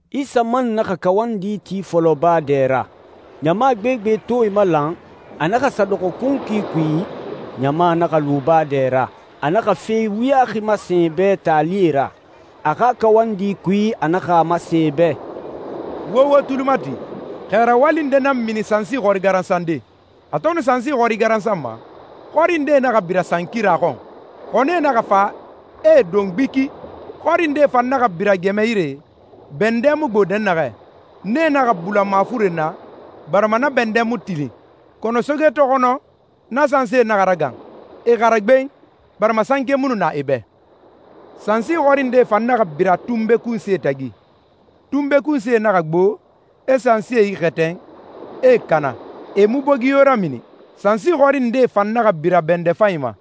Isa man naxa kawandi ti fɔlɔ baa dɛ ra. Ɲama gbegbe to e malan, a naxa sa dɔxɔ kunkui kui, ɲama naxa lu baa dɛ ra. A naxa fe wuyaxi masen e bɛ taalie ra. A xa kawandi kui, a naxa a masen e bɛ, «Wo wo tuli mati. Xɛ rawali nde nan mini sansi xɔri garansande. A to nu sansi xɔri garansanma, xɔri ndee naxa bira sankira xɔn, xɔnie naxa fa, e e don gbiki. Xɔri ndee fan naxa bira gɛmɛ yire, bɛndɛ mu gbo dɛnnaxɛ. Nee naxa bula mafuren na, barima na bɛndɛ mu tilin. Kɔnɔ soge to xɔnɔ, na sansie naxa ragan, e xara gben, barima sanke mu nu na e bɛ. Sansi xɔri ndee fan naxa bira tunbe kunsie tagi. Tunbe kunsie naxa gbo, e sansie ixɛtɛn, e e kana, e mu bogi yo ramini. Sansi xɔri ndee fan naxa bira bɛndɛ fanyi ma.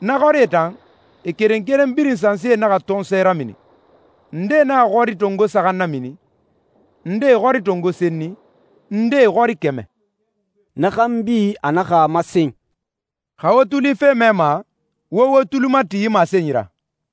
Na xɔrie tan, e keren keren birin sansie naxa tɔnsɔɛ ramini, ndee naxa xɔri tongo saxan namini, ndee xɔri tongo senni, ndee xɔri kɛmɛ.» Na xanbi, a naxa a masen, «Xa wo tuli fe mɛma, wo wo tuli mati yi masenyi ra.»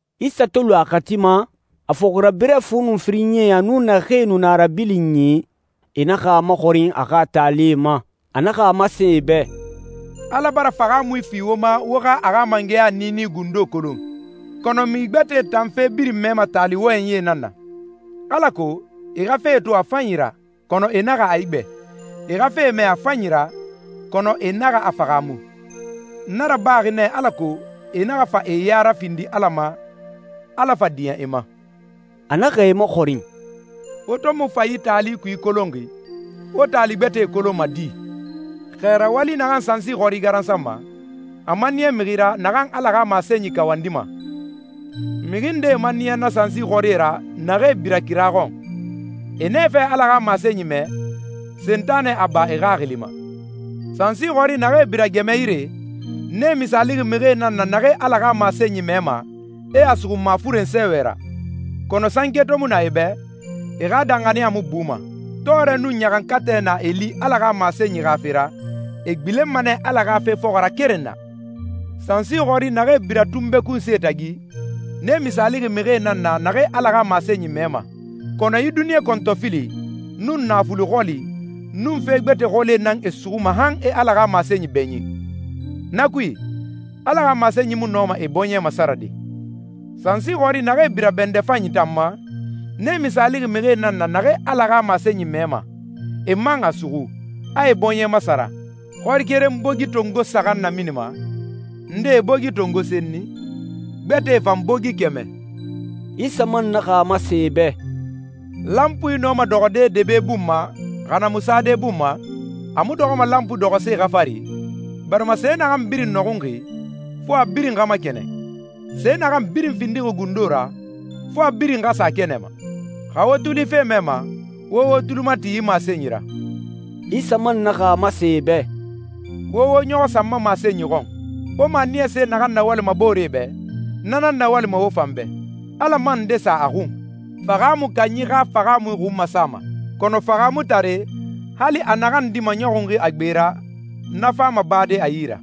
Isa to lu a xati ma, a fɔxirabirɛ fu nun firinyie a nun naxee nu na a rabilinyi, e naxa a maxɔrin a xa taalie ma. A naxa a masen e bɛ, «Ala bara fahaamui fi wo ma wo xa a xa mangɛya niini gundo kolon, kɔnɔ mixi gbɛtɛe tan fe birin mɛma taali wɔyɛnyie nan na, alako ‹E xa fe to a fanyi ra, kɔnɔ e naxa a igbɛ. E xa fe mɛ a fanyi ra, kɔnɔ e naxa a fahaamu. Na rabaxi nɛ alako e naxa fa e ya rafindi Ala ma, Ala fa diɲɛ e ma.›» A naxa e maxɔrin, «Wo to mu fa yi taali kui kolonxi, wo taali gbɛtɛe kolonma di? Xɛ rawali naxan sansi xɔri garansanma, a maniya mixi ra naxan Ala xa masenyi kawandima. Mixi ndee maniyaxi na sansi xɔrie ra naxee bira kira xɔn. E nɛfɛ Ala xa masenyi mɛ, Sentanɛ a ba e xaxili ma. Sansi xɔri naxee bira gɛmɛ yire, nee misaalixi mixie nan na naxee Ala xa masenyi mɛma, e a suxu mafuren sɛɛwɛ ra. Kɔnɔ sanke to mu na e bɛ, e xa danxaniya mu buma. Tɔɔrɛ nun ɲaxankatɛ na e li Ala xa masenyi xa fe ra, e gbilenma nɛ Ala xa fe fɔxɔ ra keren na. Sansi xɔri naxee bira tunbe kunsie tagi, nee misaalixi mixie nan na naxee Ala xa masenyi mɛma, kɔnɔ yi duniɲa kɔntɔfili, nun naafuli xɔli, nun fe gbɛtɛe xɔli nan e suxuma han e Ala xa masenyi bɛɲin. Na kui, Ala xa masenyi mu nɔma e bɔɲɛ masarade. Sansi xɔri naxee bira bɛndɛ fanyi tan ma, nee misaalixi mixie nan na naxee Ala xa masenyi mɛma, e man a suxu, a e bɔɲɛ masara. Xɔri keren bogi tongo saxan naminima, ndee bogi tongo senni, gbɛtɛe fan bogi kɛmɛ.» Isa man naxa a masen e bɛ, «Lanpui nɔma dɔxɔde debe bun ma, xa na mu sade bun ma? A mu dɔxɔma lanpui dɔxɔse xa fari? Barima se naxan birin nɔxunxi, fo a birin xa makɛnɛn. Se naxan birin findixi gundo ra, fo a birin xa sa kɛnɛ ma. Xa wo tuli fe mɛma, wo wo tuli mati yi masenyi ra.» Isa man naxa a masen e bɛ, «Wo wo ɲɔxɔ sa n ma masenyi xɔn. Wo maniyase naxan nawalima booree bɛ, na nan nawalima wo fan bɛ, Ala man nde sa a xun. Fahaamui kanyi xa fahaamui xun masama, kɔnɔ fahaamutare, hali a naxan di maɲɔxunxi a gbe ra, na fama bade a yi ra.»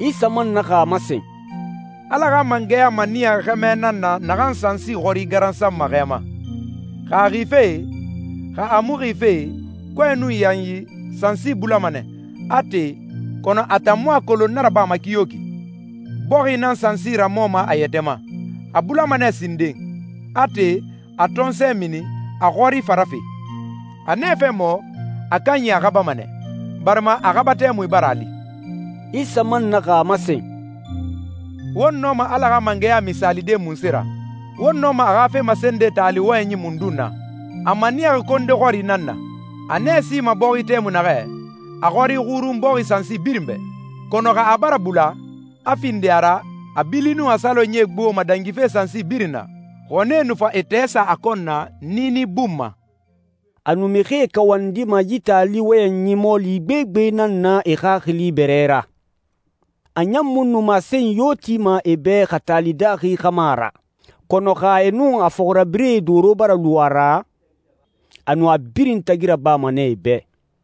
Isa man naxa a masen, «Ala xa mangɛya maniyaxi xɛmɛ nan na naxan sansi xɔri garansanma xɛ ma. Xa a xife, xa a mu xife, kɔɛ nun yanyi, sansi bulama nɛ, a te, kɔnɔ a tan mu a kolon na rabama kiyoki. Bɔxi nan sansi ramɔma a yɛtɛ ma. A bulama nɛ sinden, a te, a tɔnsɔɛ mini, a xɔri fa rafe. A nɛfɛ mɔ, a kanyi a xabama nɛ, barima a xaba tɛmui bara a li.» Isa man naxa a masen, «Won nɔma Ala xa mangɛya misaalide munse ra? Won nɔma a xa fe masende taali wɔyɛnyi mundun na? A maniyaxi konde xɔri nan na. A nɛ sima bɔxi tɛmui naxɛ, a xɔri xurun bɔxi sansi birin bɛ, kɔnɔ xa a bara bula, a findi a ra, a bili nun a salonyie gboma dangife sansi birin na, xɔnie nu fa e tɛɛ sa a kɔn na, niini bun ma.» A nu mixie kawandima yi taali wɔyɛnyi mɔɔli gbegbe nan na e xaxili bɛrɛ ra. A ɲan mu nu masenyi yo tima e bɛ xa taali daaxi xa ma ra. Kɔnɔ xa e nun a fɔxirabirɛe doro bara lu a ra, a nu a birin tagi rabama nɛ e bɛ.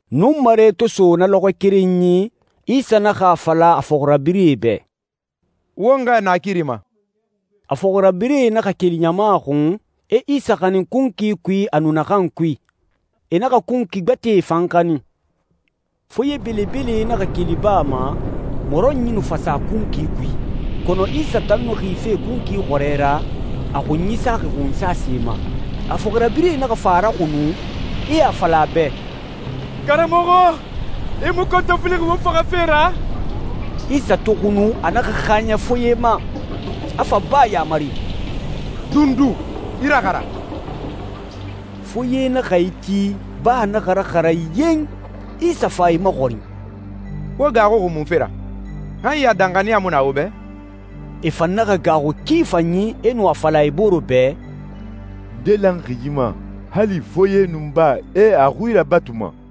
Nunmare to so na lɔxɔɛ kerenyi, Isa naxa a fala a fɔxirabirɛe bɛ, «Won xɛɛ naakiri ma.» A fɔxirabirɛe naxa keli ɲama xun, e Isa xanin kunkui kui a nu naxan kui. E naxa kunkui gbɛtɛe fan xanin. Foye belebele naxa keli baa ma, mɔrɔnyi nu fa sa kunkui kui. Kɔnɔ Isa tan nu na xife kunkui xɔrɛ ra, a xunyi saxi xunsase ma. A fɔxirabirɛe naxa fa a raxunu, e a fala a bɛ, «Karamɔxɔ, i mu kɔntɔfilixi won faxafe ra?» Isa to xunu, a naxa xaaɲɛ foye ma, a fa baa yamari, «Dundu! I raxara!» Foye naxa iti, baa naxa raxara yen! Isa fa e maxɔrin, «Wo gaaxuxi munfe ra? Han ya danxaniya mu na wo bɛ?» E fan naxa gaaxu ki fanyi, e nu a fala e bore bɛ, «Nde lanxi yi ma? Hali foye nun baa, e a xui rabatuma.»